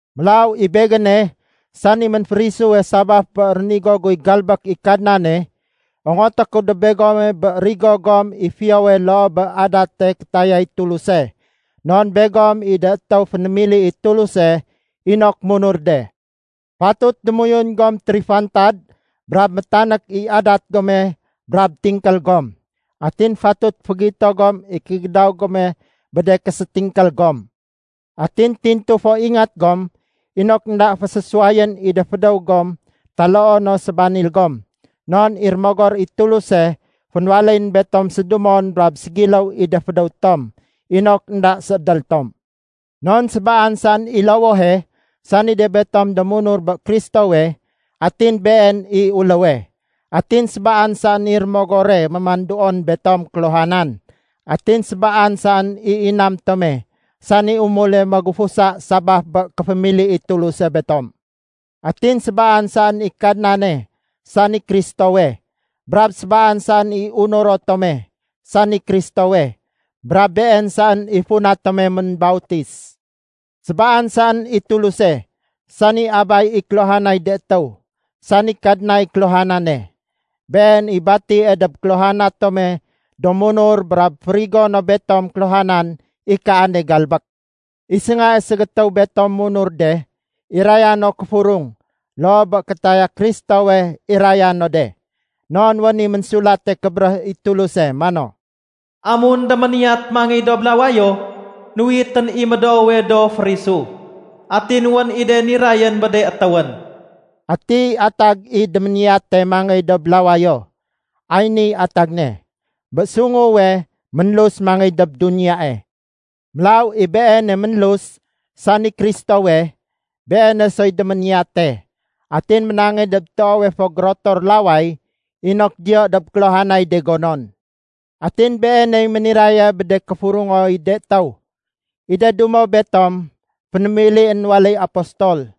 Mélaw i begéne, sani ménférisuwe sabaf bé rénigo guy galbék i Kadnane, ongoté ku dob begome bé rigo gom i fiyowe loo bé adate kétayay Tuluse, non begom i de étéw fénémili i Tuluse inok munur de. Fatut démoyun gom térifantad brab métanék i adat gome brab tingkél gom. Atin fatut fégito gom i kégédaw gome bé de késétingkél gom. Atin tintu fo ingat gom inok énda fésésuwayén i de fédéw gom taloo no sébanil gom, non i Rémogor i Tuluse fénwaléyén betom sédumon brab ségiléw i de fédéw tom inok énda séédél tom. Non sébaan saén i lowohe, sani de betom do munur bé Kristowe, atin Been i uléwe. Atin sébaan saén i Rémogore mémanduon betom kéluhanan. Atin sébaan saén i inam tome sani umule magufusa sabaf bé kéfémili i Tuluse betom. Atin sébaan saén i Kadnane sani Kristowe, brab sébaan saén i unuro tome sani Kristowe, brab Been saén i funa tome ménbautis. Sébaan saén i Tuluse, sani Abay i kéluhanay de étéw, sani Kadnay kéluhanane. Been i batie dob kéluhana tome do munur brab férigo no betom kéluhanan i kaane galbék. I séngae ségétéw betom munur de, iraya no kéfurung loo bé kétaya Kristowe iraya no de. Non wén i Ménsulate Kébéréh i Tuluse mano, “Amun déméniyat mangéy dob lawayo, nuwitén i médoowe do férisu. Atin wén i de nirayén bé de étéwén.” Ati atag i “déméniyate mangéy dob lawayo?” Ay niy atag ne: bé sunguwe ménlus mangéy dob duniyae. Mélaw i Beene ménlus, sani Kristowe, Beene soy déméniyate. Atin ménangéy dob toowe fo gérotor laway inok diyo dob kéluhanay de gonon. Atin Beeney méniraye bé de kéfurungoy de étéw. I de dumo betom, fénémilién waléy apostol.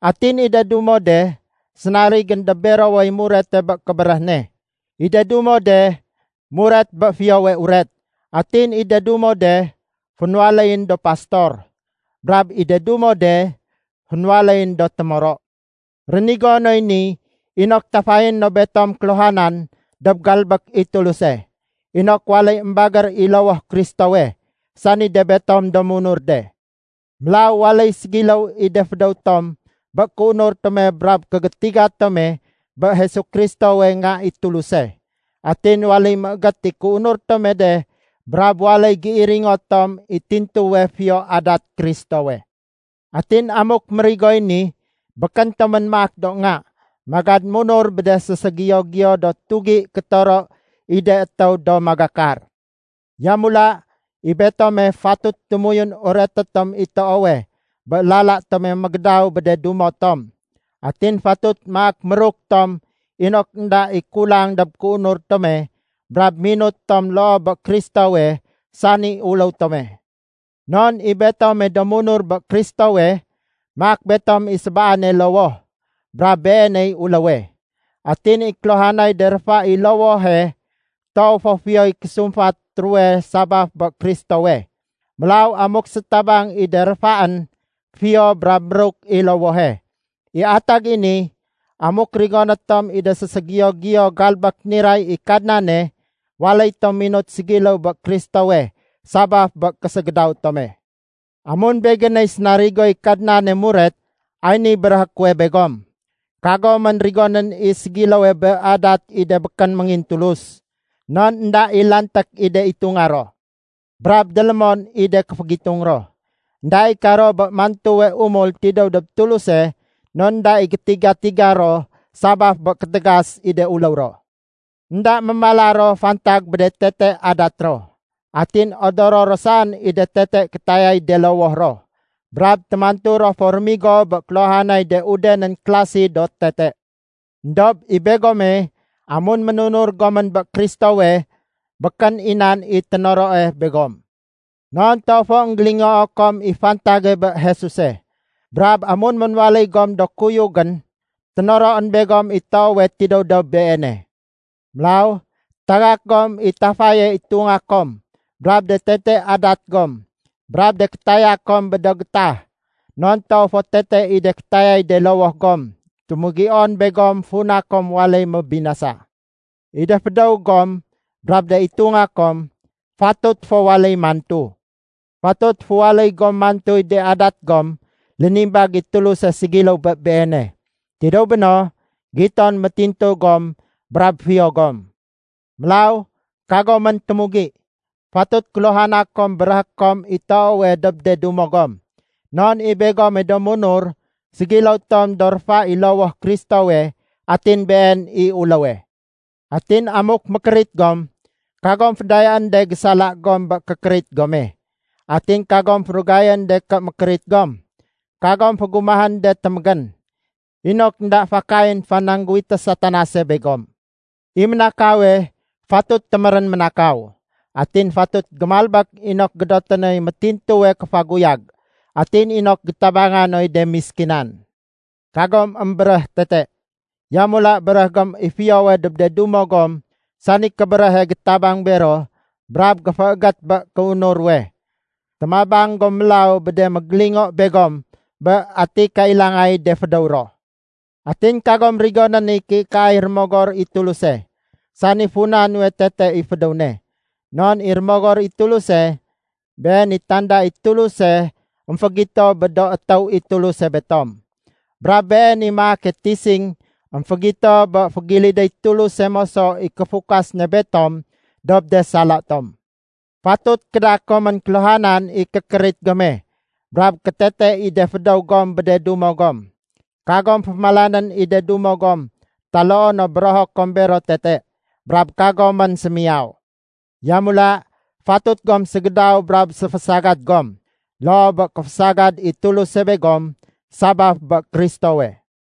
Atin i de dumo de sénarigén dob berowey murete bé kébéréh ne. I de dumo de muret bé Fiyowe Uret. Atin i de dumo de, fénwaléyén do pastor. Brab i de dumo de, fénwaléyén do témoro. Rénigo noy ni inok tafayé no betom kéluhanan dob galbék i Tuluse, inok waléy émbagér i lowoh Kristowe, sani de betom do munur de. Mélaw waléy ségiléw i de fédéw tom bé kéunur tome brab kégétiga tome bé Jesu Kristowe Nga i Tuluse. Atin waléy méégét i kéunur tome de brab waléy géiringo tom i tintuwe fiyo adat Kristowe. Atin amuk mérigoy ni, békén tomén maak do nga, magad munur bé de séségiyo-giyo do tugi kétoro i de étéw do magakar. Yamula, i betome fatut démoyun ureté tom i toowe bé lala tome mégédaw bé de dumo tom. Atin fatut maak méruk tom inok énda i kulang dob kéunur tome brab minut tom loo bé Kristowe sani uléw tome. Non i betome do munur bé Kristowe, maak betom i sébaane lowoh, brab Beeney uléwe. Atin i kéluhanay de réfa i lowohe toow fo fiyoy késumfat ruwe sabaf bé Kristowe. Mélaw amuk sétabang i de réfaén, fiyo brab méruk i lowohe. I atag i ni, amuk rigoné tom i de séségiyo-giyo galbék niray i Kadnane, waléy tom minut ségiléw bé Kristowe sabaf bé késégédaw tome. Amun begéney sénarigoy Kadnane muret, ay niy béréhé kuwe begom: Kagomén rigonén i ségiléwe bé adat i de békén méngintulus, non énda i lanték i de itunga ro. Brab délémon i de kéfégitung ro. Enda i karo bé mantuwe umul tidéw dob Tuluse non énda i gétiga-tiga ro sabaf bé kétégas i de uléw ro. Enda mémala ro fantag bé de tete adat ro. Atin odoro ro saén i de tete kétayay de lowoh ro, brab témantu ro fo rémigo bé kéluhanay de udenén klasi do tete. Endob i begome, amun ménunur gomén bé Kristowe, békén i nan i ténoroe begom. Non toow fo énggélingoo kom i fantage bé Jesuse. Brab amun ménwaléy gom do kuyugén, ténoroén begom i toowe tidéw dob Beene. Mélaw tagak gom i tafaye itunga kom brab de tete adat gom brab de kétaya kom bé do gétah, non toow fo tete i de kétayay de lowoh gom témugion begom funa kom waléy mébinasa. I de fédéw gom brab de itunga kom fatut fo waléy mantu. Fatut féwaléy gom mantuy de adat gom lénimbag i Tuluse ségiléw bé Beene. Tidéw béno, giton métintu gom brab fiyo gom. Mélaw kagomén témugi! Fatut kéluhana kom béréhé kom i toowe dob de dumo gom. Non i begome do munur ségiléw tom do réfa i lowoh Kristowe atin Been i uléwe. Atin amuk mékérit gom, kagom fédayaén de gésala gom bé kékérit gome. Atin kagom férugayén de ké mékérit gom, kagom fégumahén de témégén. Inok énda fakayén fanangguwité Satanase begom. I ménakawe fatut témérén ménakaw. Atin fatut gémalbék inok gédoté noy méntintuwe kéfaguyag atin inok gétabanga noy de méskinan. Kagom émbéréh tete. Yamula béréh gom i fiyowe dob de dumo gom sani kébéréhe gétabang bero brab géféégét bé kéunur ruwe. Témabang gom mélaw bé de mégélingo begom bé ati kailangay de fédéw ro. Atin kagom rigonén i kéikaay Rémogor i Tuluse, sani funa nuwe tete i fédéw ne. Non i Rémogor i Tuluse, Been i tanda i Tuluse émfégito bé do étéw i Tuluse betom. Brab Been i maake tising émfégito bé fégilidéy Tuluse moso i kéfukas ne betom dob de sala tom. Fatut kéda komén kéluhanan i kékérit gome brab kétete i de fédéw gom bé de dumo gom. Kagom fémalanén i de dumo gom taloo no bérého kom bero tete. Brab kagomén sémiyaw. Yamula fatut gom ségédaw brab séfésagad gom, loo bé kéfésagad i Tuluse begom sabaf bé Kristowe.